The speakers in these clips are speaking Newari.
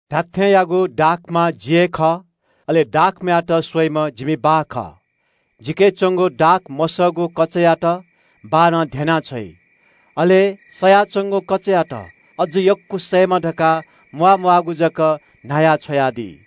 “धात्‍थेंयागु दाखमा जि हे खः, अले दाखमायात स्‍वइम्‍ह जिमि बाः खः। जिके च्‍वंगु दाख मसःगु कचायात बाःनं ध्‍यनाः छ्वइ। अले सयाच्‍वंगु कचायात अझ यक्‍व सयेमा धकाः न्‍हायादी।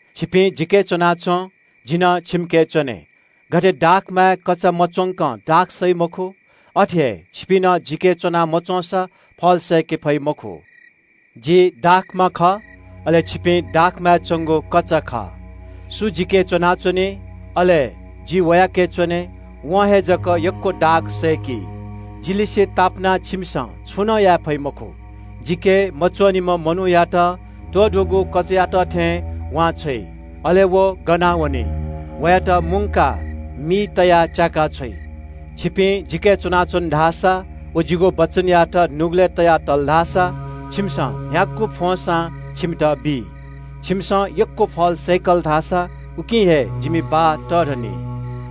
छिपिं जिके च्‍वनाच्‍वँ, जि नं छिमिके च्‍वने। गथे कचां दाखमाय् मच्‍वंकं दाख सय्‌के फइ मखु, अथे हे छिपिं नं जिके च्‍वना मच्‍वंसा फल सय्‌के फइ मखु। “जि दाखमा खः, अले छिपिं दाखमाय् च्‍वंगु कचा खः। सु जिके च्‍वनाच्‍वनी, अले जि वयाके च्‍वने, वं हे जक यक्‍व दाख सय्‌की। जिलिसें तापानाः छिमिसं छुं नं याये फइ मखु। जिके मच्‍वनीम्‍ह मनूयात त्‍वधूगु कचायात थें वांछ्वइ, अले व गनावनी। वयात मुंकाः मिइ तयाः च्‍याकाछ्वइ। छिपिं जिके च्‍वनाच्‍वन धाःसा व जिगु वचनयात नुगलय् तया तल धाःसा छिमिसं न्‍ह्यागु फ्‍वंसां छिमित बी। छिमिसं यक्‍व फल सय्‌कल धाःसा उकिं हे जिमि बाः तःधनी।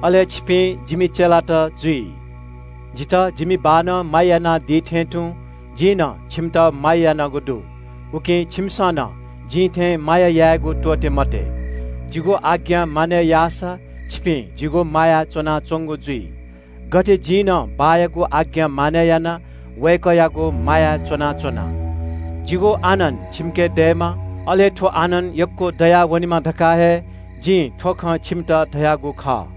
अले छिपिं जिमि चेलात जुइ। “जितः जिमि बाःनं माया यानादी थें तुं जिं नं छिमित माया यानागु दु, उकिं छिमिसं नं जिं थें माया यायेगु त्‍वःते मते। जिगु आज्ञा मानय् याःसा छिपिं जिगु मायाय् च्‍वनाच्‍वंनी, गथे जिं नं बाःयागु आज्ञा मानय् यानाः वय्‌कःयागु मायाय् च्‍वनाच्‍वना। जिगु आनन्‍द छिमिके दयेमा, अले थ्‍व आनन्‍द यक्‍व दयावनेमा धकाः हे जिं थ्‍व खँ छिमित धयागु खः।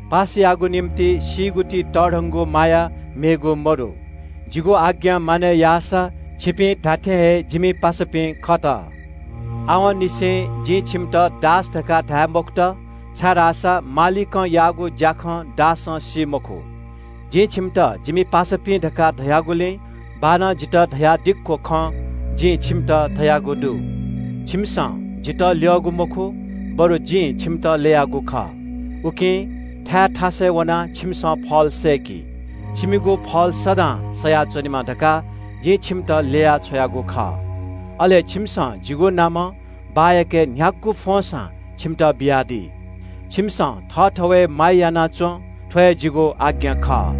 पासायागु निंतिं सीगु ति तःधंगु माया मेगु मदु। जिगु आज्ञा मानय् याःसा छिपिं धात्‍थें हे जिमि पासापिं खत। आवंनिसें जिं छिमित दास धकाः धाये मखुत, छाय्‌धाःसा मालिकं याःगु ज्‍याखँ दासं सी मखु। जिं छिमित जिमि पासापिं धकाः धयागुलिं बाःनं जितः धयादिक्‍व खँ जिं छिमित धयागु दु। छिमिसं जितः ल्‍यःगु मखु, बरु जिं छिमित ल्‍ययागु खः, उकिं थाय् थासय् वनाः छिमिसं फल सय्‌कि। छिमिगु फल सदां सयाच्‍वनेमा धकाः जिं छिमित ल्‍ययाः छ्वयागु खः। अले छिमिसं जिगु नामं बाःयाके न्‍ह्यागु फ्‍वंसां छिमित बियादी। छिमिसं थःथवय् माया याना च्‍वँ – थ्‍व हे जिगु आज्ञा खः।”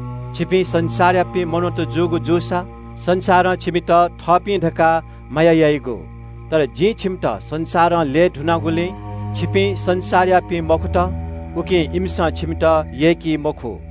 छिपिं संसारयापिं मनूत जूगु जूसा संसारं छिमित थःपिं धकाः माया याइगु, तर जिं छिमित संसारं ल्‍यये धुनागुलिं छिपिं संसारयापिं मखुत, उकिं इमिसं छिमित यय्‌की मखु।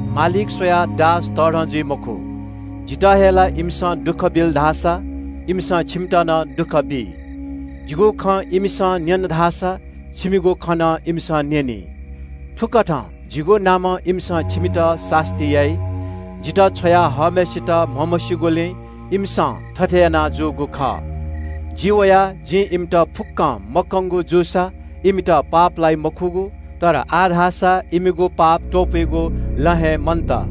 ‘मालिक स्‍वयाः दास तःधं जुइ मखु’ धकाः जिं नकतिनि धयागु खँ लुमंकी। जितः हेला यानाः इमिसं दुःख बिल धाःसा छिमित नं दुःख बी। जिगु खँ इमिसं न्‍यन धाःसा छिमिगु खँ नं इमिसं न्‍यनी। थुकथं जिगु नामं इमिसं छिमित सास्‍ती याइ। जितः छ्वया हःम्‍हय्‌सित म्‍हमस्‍यूगुलिं इमिसं थथे याना जूगु खः। जि वयाः जिं इमित फुक्‍कं मकंगु जूसा इमित पाप लाइ मखुगु। तर आः धाःसा इमिगु पाप त्‍वपुइगु लँ हे मन्‍त।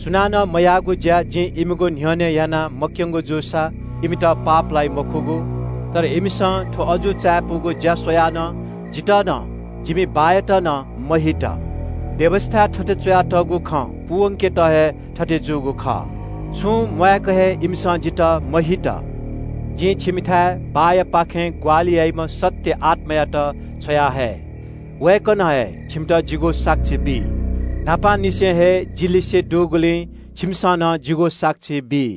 सुनानं मयाःगु ज्‍या जिं इमिगु न्‍ह्यःने यानाः मक्‍यंगु जूसा इमित पाप लाइ मखुगु। तर इमिसं थ्‍व अजू चायापुगु ज्‍या स्‍वयाः नं जितः व जिमि बाःयात नं हेला यात। व्‍यवस्‍थाय् थथे च्‍वयातःगु खँ पूवंकेत हे थथे जूगु खः – ‘छुं म्‍वाय्‌क हे इमिसं जितः हेला यात।’ “जिं छिमिथाय् बाःयापाखें ग्‍वाहालि याइम्‍ह सत्‍य आत्‍मायात छ्वयाहये। वय्‌कलं हे छिमित जिगु साक्षी बी। छिपिं न्‍हापांनिसें हे जि लिसे दुगुलिं छिमिसं नं जिगु साक्षी बी।”